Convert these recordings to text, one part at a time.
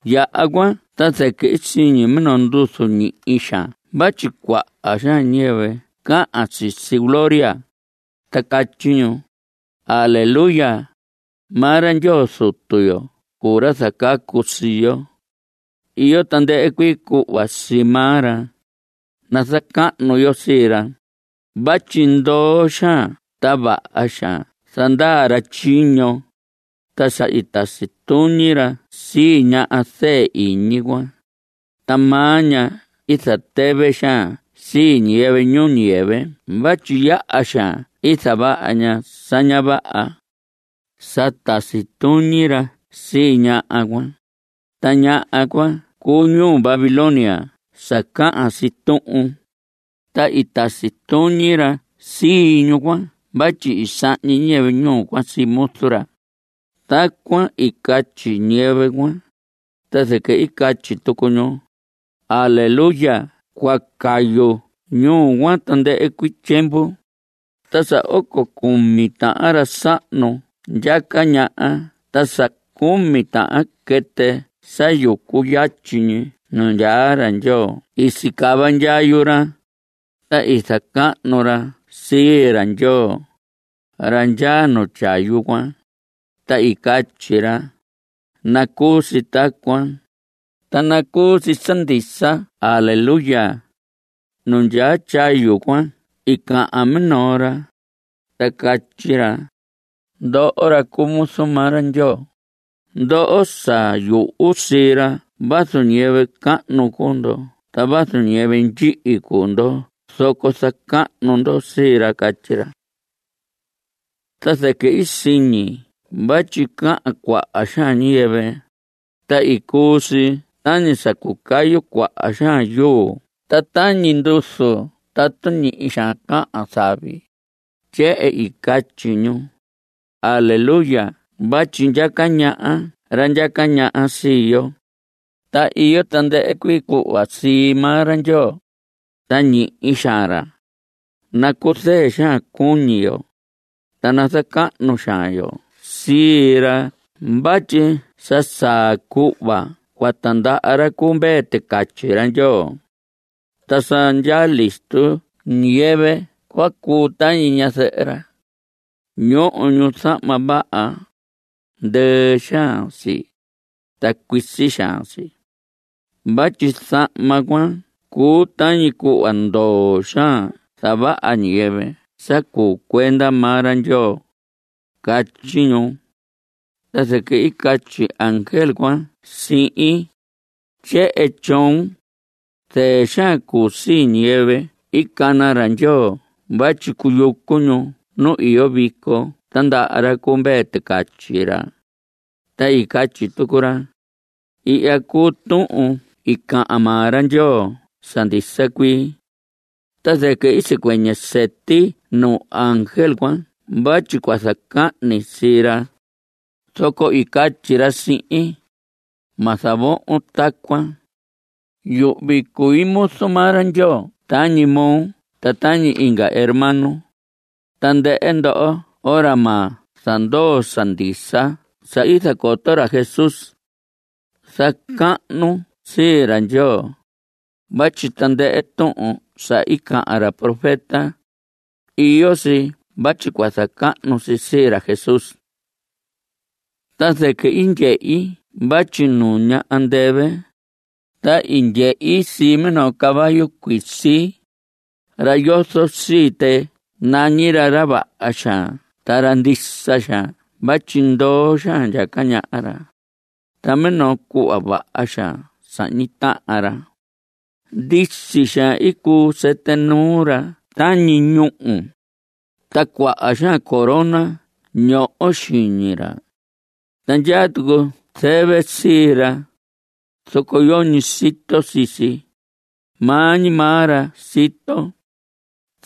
Yaha cuan ta zɨquɨ i siñi minoo nduzu ñihi xaan vatyi cuaha xaan ñiyɨvɨ cahan sisi gloria, ta catyi ñu: ¡Aleluya! Maa ra Ndyoo Zutu yo cuu ra zacacu sii yo. Iyo tandɨhɨ cuii cuhva sii maa ra. Nazacahnu yo sii ra. Vatyi ndoo xaan ta vaha xaan zandaa ra tyiño. Ta sa i tasi tuñi ra sii ñaha zɨɨ iñi cuan. Ta maa ña i zatɨvɨ xaan sii ñiyɨvɨ ñuu ñiyɨvɨ vatyi yaha xaan i zavaha ña sa ña vaha. Sa tasi tuñi ra sii ñaha cuan. (Ta ñaha cuan cuu ñuu Babilonia sa cahan si tuhun.) Ta i tasi tuñi ra sii ñuu cuan vatyi i sahñi ñiyɨvɨ ñuu cuan sii muzu ra. Tacuan i catyi ñiyɨvɨ cuan, ta zɨquɨ i catyi tucu ñu: ¡Aleuya! Cua cayu ñuu cuan tandɨhɨ cuii tyiemvu. Ta sa oco cumi tahan ra sahnu ndyaca ñaha ta sa cumi tahan quɨtɨ sa yucu yatyi ñi nu ndyaa ra Ndyoo i sicava ndyayu ra, ta i zacahnu ra sii ra Ndyoo, ra ndyaa nu tyayu cuan, ta i catyi ra: ¡Nacuu si tacuan, ta nacuu si sa ndisa! ¡Aleyuya! Nu ndyaa tyayu cuan i cahan minoo ra, ta catyi ra: Ndoho ra cuu muzu maa ra Ndyoo, ndoho sa yuhu sii ra vazu ñiyɨvɨ cahnu cuu ndo a vazu ñiyɨvɨ ndyihi cuu ndo zoco zacahnu ndo sii ra, catyi ra. Ta zɨquɨ i siñi vatyi cahan cuaha xaan ñiyɨvɨ, ta i cuu si tañi sa cucayu cuaha xaan yuu ta tañi nduzu tatu ñihi xaan cahan zavi. Tyehen i catyi ñu: ¡Aleyuya! Vatyi ndyaca ñaha ra ndyaca ñaha sii yo, ta iyo tandɨhɨ cuii cuhva sii maa ra Ndyoo, ta ñihi xaan ra. Nacuzɨɨ xaan cuñi yo, ta nazacahnu xaan yo sii ra vatyi sa saa cuhva cua tindaha ra cu Mvee Ticatyi ra Ndyoo. Ta sa ndyaa listo ñiyɨvɨ cua cuu tañi ñazɨhɨ ra. Ñoho ñu zahma vaha; ndɨɨ xaan si, ta cuisi xaan si. Vatyi zahma cuan cuu tañi cuhva ndoo xaan zavaha ñiyɨvɨ sa cuu cuenda maa ra Ndyoo. Catyi ñu. Ta zɨquɨ i catyi ángel cuan sihin: Tyehen tyoon: “Zɨɨ xaan cuu sii ñiyɨvɨ i cana ra Ndyoo vatyi cuyucu ñu nu iyo vico tandaha ra cu Mvee Ticatyi ra.” Ta i catyi tucu ra: Ihya cuu tuhun i cahan maa ra Ndyoo sa ndisa cuii. Ta zɨquɨ i sicuɨñɨ sɨti nuu ángel cuan vatyi cua zacahni sii ra, zoco i catyi ra sihin: Ma zavohon tacuan. Yuhvi cui muzu maa ra Ndyoo tañi moo ta tañi inga hermanon, tandɨhɨ ndoho ra ma zandoo sa ndisa sa i zacoto ra Jesús. Zacahnun sii ra Ndyoo. Vatyi tandɨhɨ tuhun sa cahan ra profeta, iyo si vatyi cua zacahnu si sii ra Jesús. Ta zɨquɨ i ndyehi vatyi nuña andɨvɨ, ta i ndyehi sii minoo caballo cuisi. Ra sa yozo sii tɨ nañi ra, Ra Vaha Xaan ta Ra Ndisa Xaan vatyi ndoo xaan ndyaca ñaha ra, ta minoo cuhva vaha xaan sahñi tahan ra. Ndisi xaan i cuu sɨtɨ nuu ra tañi ñúhu, ta cuaha xaan corona ñoho xiñi ra, ta ndyaa tucu zɨvɨ sii ra, zoco yoñi sito sii si; maa ñi maa ra sito.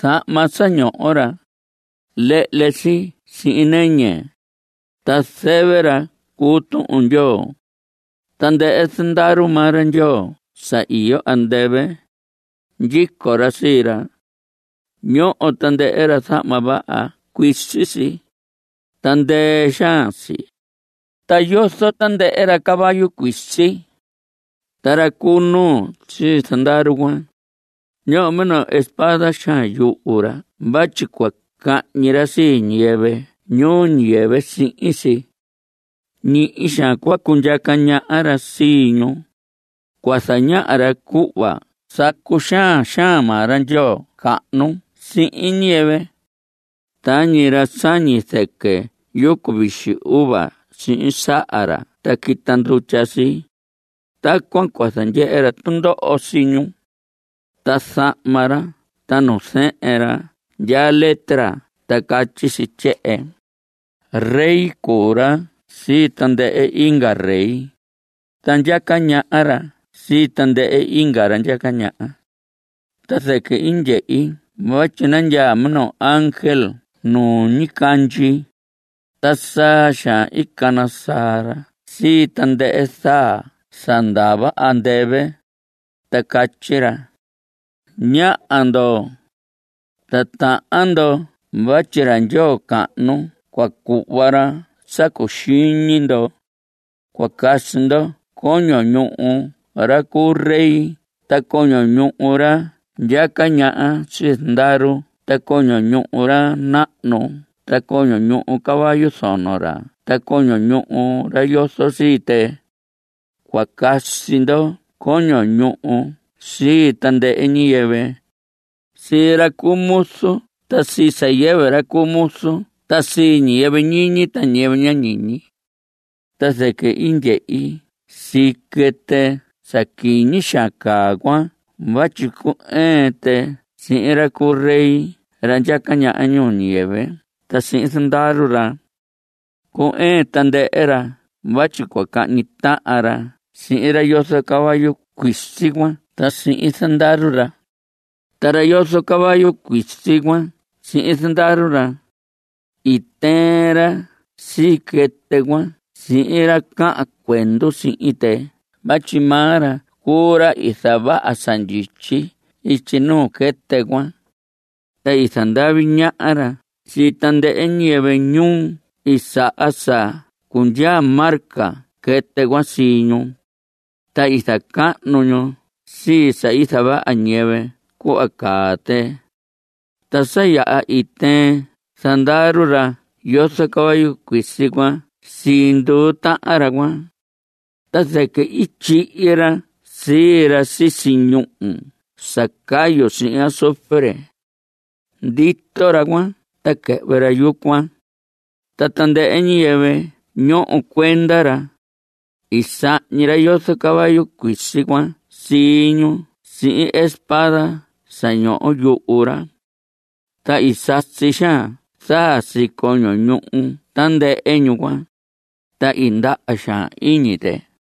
Zahma sa ñoho ra, lehle si sihin nɨñɨ, ta zɨvɨ ra cuu Tuhun Ndyoo. Tandɨhɨ zandaru maa ra Ndyoo sa iyo andɨvɨ, ndyico ra sii ra. Ñoho tandɨhɨ ra zahma vaha. Cuisi si, ta ndɨɨ xaan si. Ta yozo tandɨhɨ ra caballo cuisi. Ta ra cu nuu sii zandaru cuan, ñoho minoo espada xaan yuhu ra vatyi cua cañi ra sii ñiyɨvɨ ñuu ñiyɨvɨ sihin si. Ñihi xaan cua cundyaca ñaha ra sii ñu. Cua zañaha ra cuhva sa cuxaan xaan maa ra Ndyoo cahnu sihin ñiyɨvɨ. Tañi ra sañi zɨquɨ yucu vixi uva sihin saha ra ta quita ndutya si, tacuan cua zandyehe ra tundoho sii ñu. Ta zahma ra ta nu zɨhɨn ra ndyaa letra ta catyi si tyehen: “Rey cuu ra sii tandɨhɨ inga rey, ta ndyaca ñaha ra sii tandɨhɨ inga ra ndyaca ñaha.” Ta zɨquɨ i ndyehi vatyi nandyaa minoo ángel nu ñicandyi, ta saa xaan i cana saa ra sii tandɨhɨ zaa sa ndava andɨvɨ, ta catyi ra: Ñaha ndo. Titahan ndo vatyi ra Ndyoo cahnu cua cuhva ra sa cuxiñi ndo. Cua casi ndo coño ñuhu ra cu rey ta coño ñuhu ra ndyaca ñaha sii zandaru ta coño ñuhu ra nahnu ta coño ñuhu caballo zono ra ta coño ñuhu ra yozo sii tɨ. Cua casi ndo coño ñuhu sii tandɨhɨ ñiyɨvɨ, sii ra cu muzu ta sii sa yɨvɨ ra cu muzu ta sii ñiyɨvɨ ñiñi ta ñiyɨvɨ ña ñiñi. Ta zɨquɨ i ndyehi sii quɨtɨ sa quiñi xaan caa cuan vatyi cu‑ɨɨn tɨ sihin ra cu rey ra ndyaca ñaha ñuu ñiyɨvɨ ta sihin zandaru ra. Cu‑ɨɨn tandɨhɨ ra vatyi cua cahñi tahan ra sihin ra yozo caballo cuisi cuan ta sihin zandaru ra. Ta ra yozo caballo cuisi cuan sihin zandaru ra, i tɨɨn ra sii quɨtɨ cuan sihin ra cahan cuendu sihin tɨ vatyi maa ra cuu ra i zavaha sa ndyityi ityi nuu quɨtɨ cuan. Ta i zandavi ñaha ra sii tandɨhɨ ñiyɨvɨ, ñu i saha sa cundyaa marca quɨtɨ cuan sii ñu, ta i zacahnu ñu sii sa i zavaha ñiyɨvɨ cuhva caa tɨ. Ta sa yaha i tɨɨn zandaru ra yozo caballo cuisi cuan sii nduu tahan ra cuan, ta zɨquɨ i tyihi ra sii ra sisi ñúhu sa cayu sihin azufre. Ndito ra cuan ta quɨhvɨ ra yucuan. Ta tandɨhɨ ñiyɨvɨ ñoho cuenda ra, i sahñi ra yozo caballo cuisi cuan sii ñu sihin espada sa ñoho yuhu ra. Ta i sasi xaan zaa sii coño ñuhu tandɨhɨ ñu cuan, ta i ndaha xaan iñi tɨ.